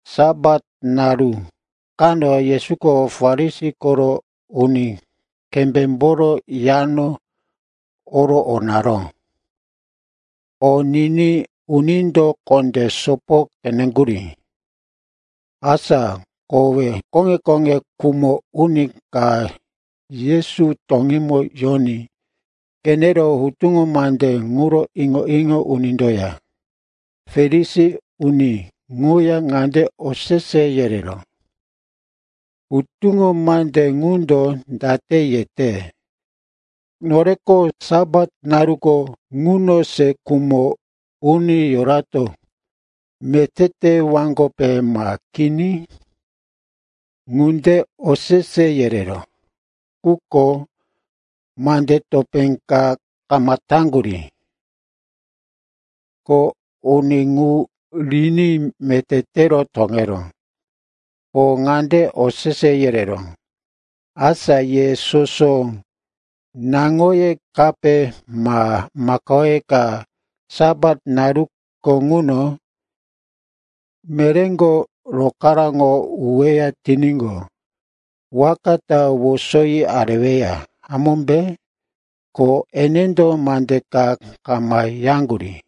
Sapat naru kano Yesuko Farisi koro uni kembémboro yano oro o naró. O niní unindo kondé sopo qeneŋgurí. Asa kowe koŋe-koŋe khumo uni ka Yesu toŋímo yoní qenero hutuŋo mande ŋuro iŋo-iŋo unindoya Farisi uni ŋuya ŋande osese yereró, “Hutuŋo mande ŋundo date yete, noreko Sapat naruko ŋuno se khumo uni yorato meté tewaŋgope ma kini?” Ŋunde osese yereró, quko mande topé ka kama taŋgurí. Ko uni ŋu riní meté tero toŋeró. Ko ŋande osese yereró, “Asa ye soso naŋoye kape ma makao ka Sapat naruko ŋuno meréko rokaráŋo uweya tiníqo, waka ta wosoyi areweya, hamómbe?” Ko enendo mande ka kama yaŋgurí.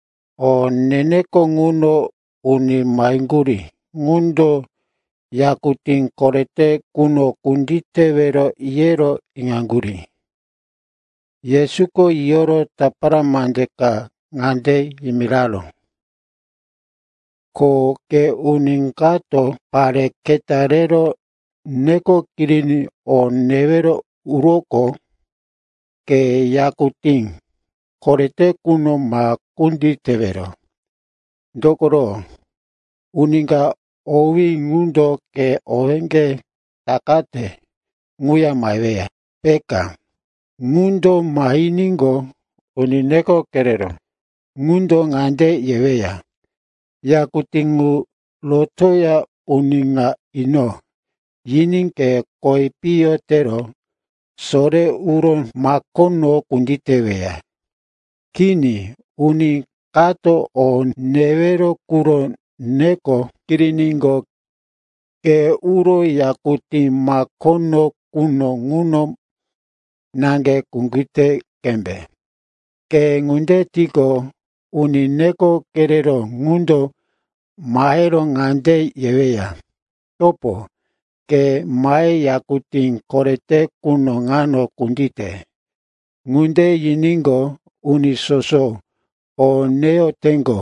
O ne-neko ŋuno uni maheŋgurí ŋundo yakutí korete quno kunditewero yero iŋaŋgurí. Yesuko yiyoro tapara mande ka ŋande yimiraró. “Ko ke uni kato pare keta rero neko kiriní o newero uroqo, ke yakutí korete quno ma kunditewero. Dokoro uni ka owí ŋundo ke owéŋge takate ŋuya maheweya, peka. Ŋundo mahiníqo, uni neko kereró ŋundo ŋande yeweya, ‘Yakutí ŋu rotoya uni ŋa ino,’ yiní ke kowi piyo tero sore uro makono kunditeweya. Kini, uni kato o newero quro neko kiriníqo, ke uro yakutí makono quno ŋuno naŋge kundite qembe. Ke ŋunde tiqo, uni neko kereró ŋundo mahero ŋande yeweya, ‘Topo, ke mahe yakutí korete quno ŋano kundite.’ Ŋunde yiníqo, uni soso o neyoteŋgo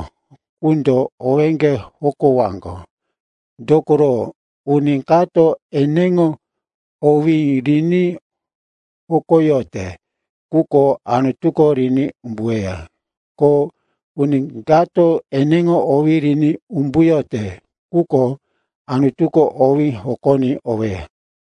ŋundo owéŋge hokowaŋgo. Dokoro uni kato eneŋo owí riní hokoyote quko Anutuko riní umbuweya. Ko uni kato eneŋo owí riní umbuyote quko Anutuko owí hokoní oweya.”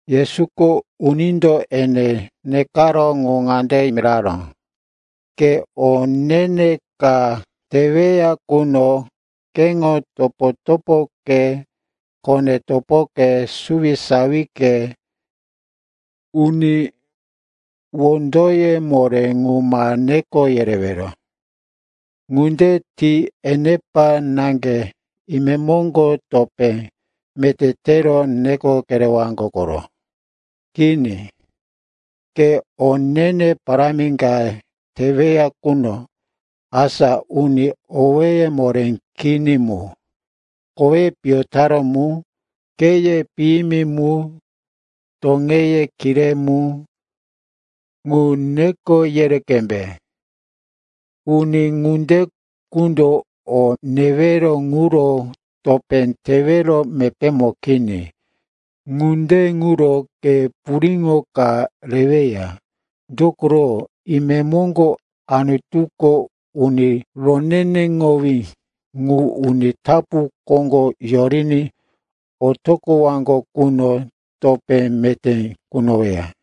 Yesuko unindo ene nekaró ŋu ŋande miraró, “Ke o ne-ne ka teweya quno, keŋo topo-topoke, kone-topoke, suwisawike, uni wondoye moré qu ma neko yerewero. Ŋunde ti enepa naŋge imemoŋgo topé meté tero neko kerewaŋgo koro. Kini, ke o ne-ne parámi ka teweya quno, asa uni owéye moré kini mu, koweye piyo taró mu, kheye piyimi mu, toŋeye kiré mu, ŋu neko yere qembe. Uni ŋunde qundo o newero ŋuro topé tewero mepémo kini. Ŋunde ŋuro ke puriŋo ka reweya, dokoro, imemoŋgo Anutuko uni roneneŋowí ŋu uni tapu koŋgo yoriní otoqowaŋgo quno, topé meté kunoweya.”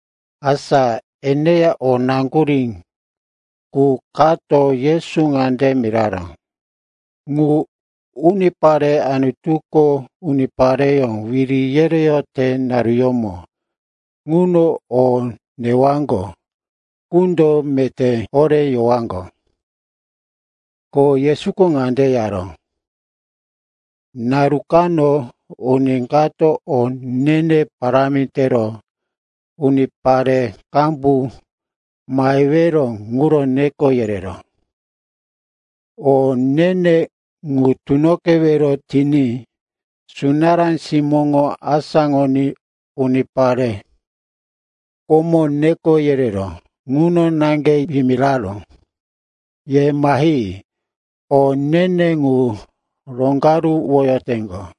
Asa eneya o naŋgurí qu kato Yesu ŋande miraró, “Ŋu unipare Anutuko unipareyó wiri yereyote naruyómo ŋuno o newaŋgo qundo meté horé yowaŋgo.” Ko Yesuko ŋande yaró, “Naru kano uni kato o ne-ne parámi tero unipare qambu mahewero quro neko yereró. O ne-ne ŋu tunoqewero tiní sunará simóŋo asáŋoní unipare komo neko yereró ŋuno naŋge yimiraró, ‘Ye mahi, o ne-ne ŋu roŋgaruwoteŋgo.’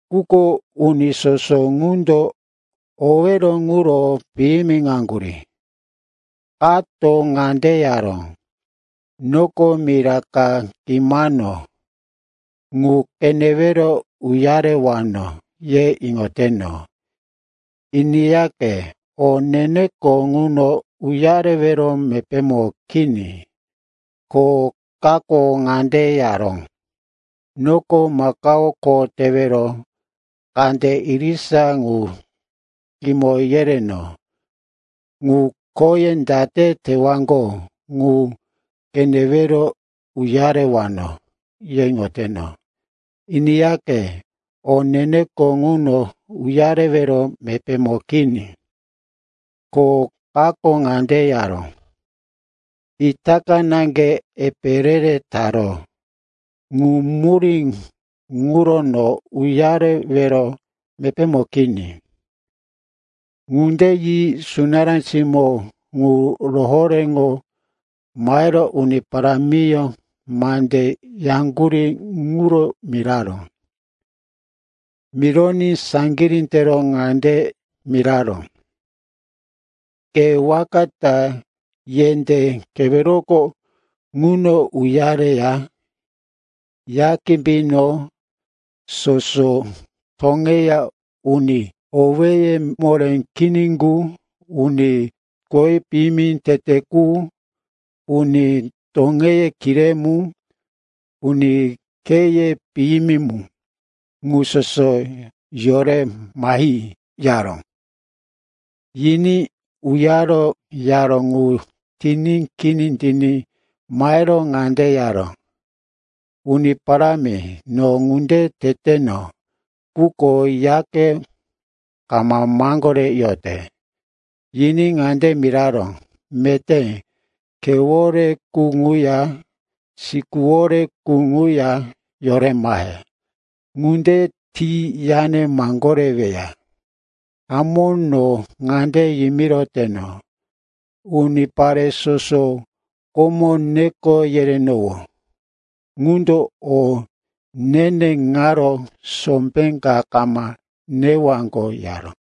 “Quko uni soso ŋundo owero ŋuro piyimiŋaŋgurí. Kato ŋande yaró, ‘Noko mira ka kimano, ŋu qenewero uyarewano, ye iŋoteno. Iniyaqe, o ne-neko ŋuno uyarewero mepémo kini.’ “Ko kako ŋande yaró, ‘Noko makao kho tewero kande irisa ŋu kimo yereno, ŋu khoye date tewaŋgo ŋu qenewero uyarewano, ye iŋoteno. Iniyaqe, o ne-neko ŋuno uyarewero mepémo kini.’ “Ko kako ŋande yaró, ‘Itaka naŋge epe re-re taro. Ŋu murí ŋuro no uyarewero mepémo kini.’ “Ŋunde yi sunará simó ŋu rohoréŋo mahero uni parámiyó mande yaŋgurí ŋuro miraró. Mironí saŋgirí tero ŋande miraró, ‘Ke waka ta yendé keweroko ŋuno uyareya, ya kimbino soso toŋeya uni owéye moré kini qu, uni koweye piyo tete qu, uni toŋeye kiré mu, uni kheye piyimi mu ŋu soso yore mahi,’ yaró. “Yiní uyaro yaró ŋu tiní kini tiní mahero ŋande yaró, ‘Uni Parámi, no ŋunde teteno, quko yake kama maŋgoreyote.’ “Yiní ŋande miraró, ‘Meté khewore qu ŋuya sikuwore qu ŋuya yore mahe. Ŋunde ti yane maŋgoreweya. Hamó, no ŋande yimiroteno, unipare soso komo neko yerenowó ŋundo o ne-ne ŋaro sombé ka kama newaŋgo,’ yaró.”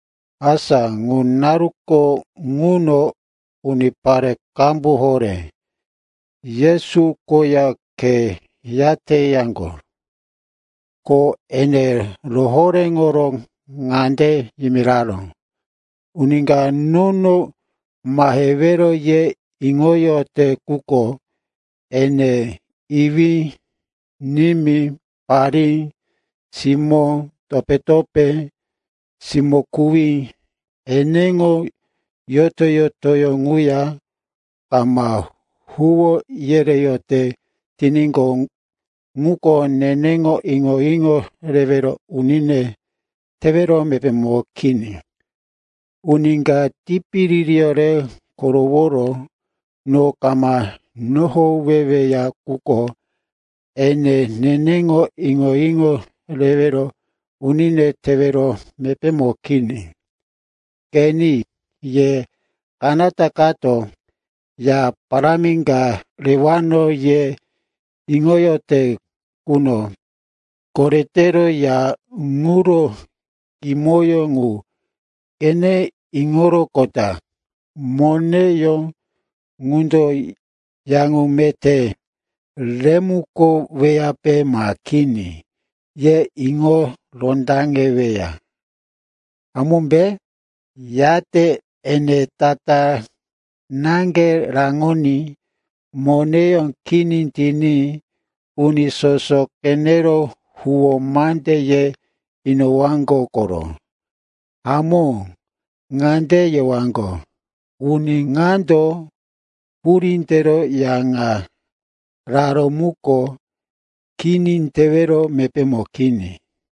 Asa ŋu naruko ŋuno unipare qambu horé Yesu koya khe yateyaŋgo, ko ene rohoréŋoro ŋande yimiraró, “Uni ka nono mahewero ye iŋoyote quko, ene iwí, nimí, parí, simó, topé-topé, simó-kuwí eneŋo yoto-yotoyó ŋuya kama huwó yereyote tiníqo, ŋuko neneŋo iŋo-iŋo rewero unine tewero mepémo kini. Uni ka tipiririyó re koroworo no kama nohoweweya quko, ene neneŋo iŋo-iŋo rewero unine tewero mepémo kini. “Qeni, ye kanata kato, ya parámi ka rewano, ye iŋoyote quno, koretero ya ŋuro kimoyó ŋu qene iŋoroqota, moneyó ŋundo ya ŋu meté remukoweyape ma kini, ye iŋo rondaŋeweya, hamómbe? Yate ene tatá naŋge raŋoní moneyó kini tiní uni soso qenero huwó mande ye inowaŋgo koro. Hamó, ŋande yewaŋgo, ‘Uni ŋando hurí tero ya ŋa raró muko kini tewero mepémo kini.’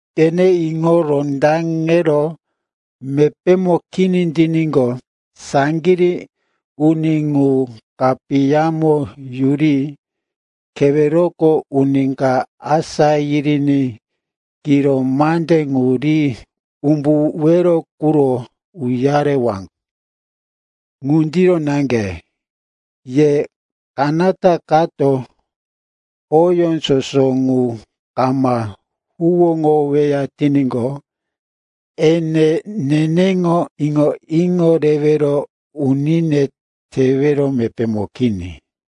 Qene iŋo rondaŋero mepémo kini tiníqo, saŋgirí uni ŋu kapiyamo yuri keweroko uni ka asá yiriní kiro mande ŋu ri umbuwero quro uyarewaŋgo. Ŋundiro naŋge, ye kanata kato oyó soso ŋu kama huwóŋoweya tiníqo, ene neneŋo iŋo-iŋo rewero unine tewero mepémo kini.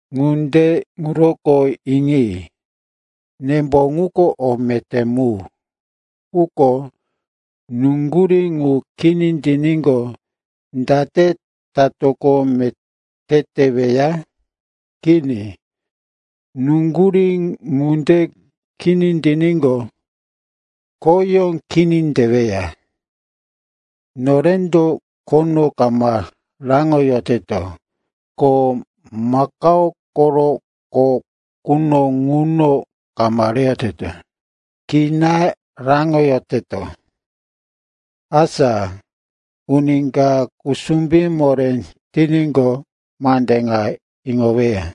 “Ŋunde ŋuroko, iŋi. Nembo ŋuko o meté mu. Quko nuŋgurí ŋu kini tiníqo, date tatoqo meté teweya? Kini, nuŋgurí ŋunde kini tiníqo, khoyó kini teweya. Norendo khono kama raŋoyoteto, ko makao koro qo quno ŋuno kama reyoteto. Kina raŋoyoteto. “Asa uni ka kusumbí moré tiníqo, mande ŋa iŋoweya.”